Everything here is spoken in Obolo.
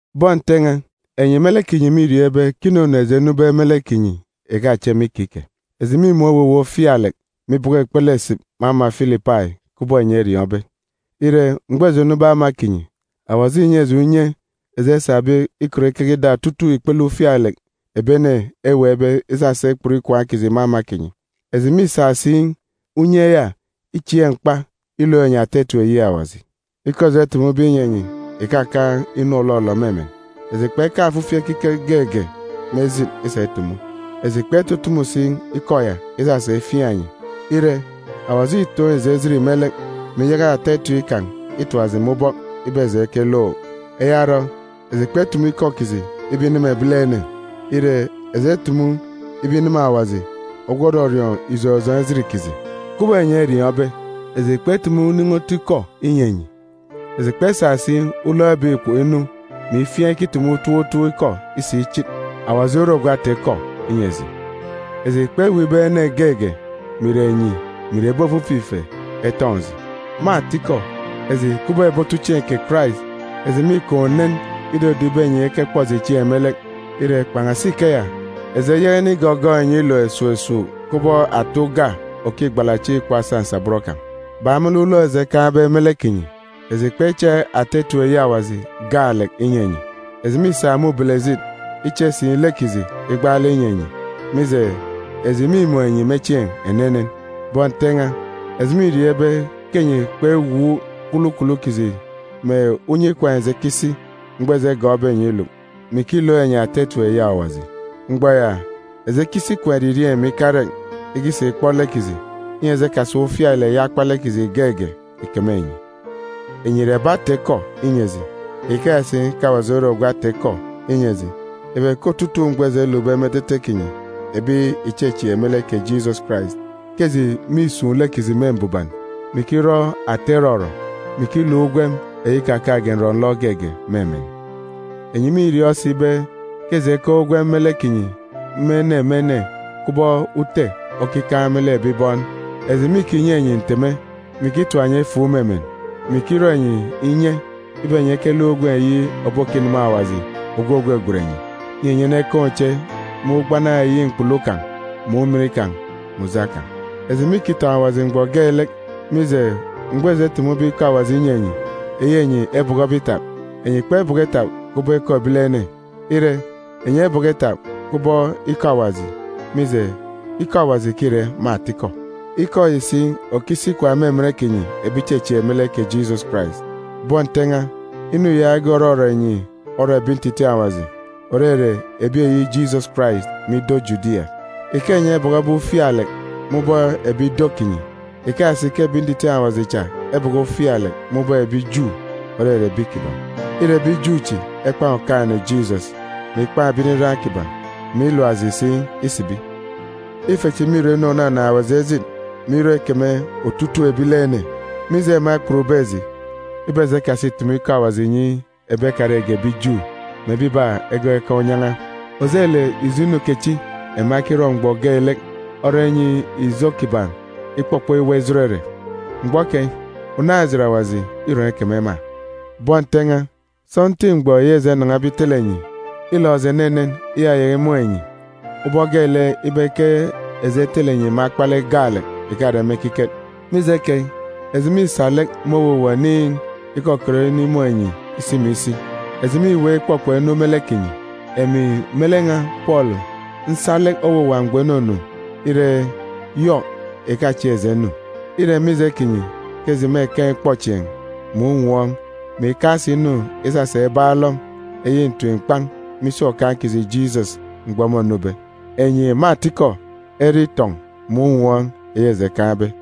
Bọn Nte n̄a, enyi me lek kinyi mîriọọn̄ ibe ke inunu eji enube me lek kinyi ìkachep me ikike. Eji mîmun̄ owuwa ufialek, mè ibọkọ ikpele esip me ama Filipai, kubọk enyi eriọọn̄be. Ire, mgbọ eji enube ama kinyi, Awaji înyi eji unye eji esabe ikọt ikeke ida otutuuk ikpele ufialek ebi ene eweekbe isasa ikput ikwaan̄ kiji me ama kinyi. Eji mîsa si unye ya ichieek mkpa ilook enyi ata etip eyi Awaji. Ikọ eji etumube inyi enyi ìkakaan̄ inu òlọlọ me emen. Eji kpekaan̄ ofifi ekiket geege me ejit isa itumu. Eji kpetutumu si ikọ ya isasa ifiaan̄ enyi. Ire, Awaji îtoon̄ eji ejit me lek, mè iyaka ata etip kan̄ itap eji me ubọk ibe eji ekelook. Eya orọ, eji kpetumu ikọ kiji ibe ineme ebilene. Ire, eji etumu ibe ineme Awaji ogwu òrọriọọn̄ ijọn̄ ijọn̄ ejit kiji. Kubọk enyi eriọọn̄be, eji kpetumu unin̄i otu ikọ inyi enyi. Eji kpesa si ulọk ebek ikpoko inu, mè ifiaan̄ ikitumu utop utop ikọ isa ichit. Awaji ore ogwu ata-ikọ inyi eji. Eji kpeweek ibe ene geege, mè ìre enyi mè ìre ebi ofifi ife, etọn̄ eji. Me atikọ, eji kubọk ebi otuchieen̄ kè Karais, eji mîkaan̄ unen idodo ibe enyi ekekpọ eji chieen̄ me lek. Ire, kpan̄asi ikeya, eji eyaka inigọgọọk enyi iluk esuuk esuuk kubọk ata uga òkigbala chieen̄ ikpọ asa nsabọn kan̄. Bak me lek ulọk eji ekaan̄be me lek kinyi, eji kpeche ata etip eyi Awaji gaalek inyi enyi, eji mîsa me ubelejit iche si lek kiji igbaalek inyi enyi, mije, eji mîmun̄ enyi me chieen̄ enenen. Bọn Nte n̄a, eji mîriọọn̄ ibe ke enyi kpewuuk kwulukwulu kiji mè unye ikwaan̄ eji ekisi mgbọ eji egọọkbe enyi iluk, mè ikilook enyi ata etip eyi Awaji. Mgbọ ya, eji ekisi ikwaan̄ eririeen̄ mè ikarek ikisa ikpọ lek kiji, inyi eji ekasa ufialek eyi akpalek kiji geege ìkeme enyi. Enyi ìre ebi ata-ikọ inyi eji, ikeya si ke Awaji ore ogwu ata-ikọ inyi eji ibe ke otutuuk mgbọ eji elukbe me etete kinyi ebi ìchechieek me lek kè Jisọs Karais, ke eji mîsun̄ lek kiji me mbuban, mè ikirọ ata irọrọ, mè ikiluk ugwem eyi ikakaan̄ge nrọ-nlọ geege me emen. Enyi mîriọọn̄ si ibe ke eji ekaan̄ ugwem me lek kinyi, me ene me ene, kubọk ute okikaan̄ me lek ebi bọn. Eji mîkinyi enyi nteme, mè ikitap enyi efuuk me emen, mè ikirọ enyi inye ibe enyi ekeluk ugwem eyi òbokineme Awaji ogwu ògwegwen enyi, inyi enyi enekaan̄ uche me ugbana eyi mkpulu kan̄, mè ujamgbugbo kan̄. Eji mîkitọn̄ Awaji mgbọ geelek, mije, mgbọ eji etumube ikọ Awaji inyi enyi, eyi enyi ebọkọbe itap, enyi kpebọkọ itap kubọk ikọ ebilene. Ire, enyi ebọkọ itap kubọk ikọ Awaji, mije, ikọ Awaji ke îre me atikọ. Ikọ yi si òkisi ikwaan̄ me emen kinyi ebi ìchechieek me lek kè Jisọs Karais. Bọn Nte n̄a, inu yaage òrọrọ enyi orọ ebi ntitiin̄ Awaji, ìrere ebi eyi Jisọs Karais, me ido Judia. Ike enyi ebọkọbe ufialek me ubọk ebi ido kinyi, ikeya si ke ebi ntitiin̄ Awaji cha ebọkọ ufialek me ubọk ebi Ju, òrere ebi kiban̄. Îre ebi Ju chi ekpan̄ Okaan̄-ene Jisọs, mè ikpan̄ ebi nriran kiban̄, mè ilap eji si isibi. Ife chi mîrọ inu ònanaan̄ Awaji ejit, mè irọ ikeme otutuuk ebilene, mije ema ekputbe eji ibe eji ekasi ìtumu ikọ Awaji ìnyi ebi ekarege ebi Ju mè ebiba egọọk ekaan̄ unyan̄a. Ojelek ijo inu kechi ema ekirọ mgbọ geelek orọ inyi ijo kiban̄ ikpọkpọ iwa ijot ere. Mgbọ keyi unaan̄-ejit Awaji îrọn̄ ikeme ema! Bọn Nte n̄a, sọntiik mgbọ yi eji enan̄abe itele enyi, îlọk eji enenen iyayaka imun̄ enyi, ubọk geelek ibe ke eji etele enyi me akpalek gaalek, ìkare me ekiket. Mije keyi, eji mîsa lek me owuwa oniin̄ ikọkọt inimun̄ enyi isi mè isi. Eji mîweek ikpọkpọk inu me lek kinyi. Emi me lek n̄a Pọọlu nsa lek owuwa mgbọ inunu, ire, Yọk ìkachieek eji enu. Îre mije kinyi ke eji mêkaan̄ ikpọchieen̄, mè unwọọn̄, mè ikaan̄ si inu isasa ibaan̄ alọm eyi ntim-mkpan̄ me isi Okaan̄ kiji Jisọs mgbọ mônube. Enyi, me atikọ, ere itọn̄ mè unwọọn̄ eyi eji ekaan̄be.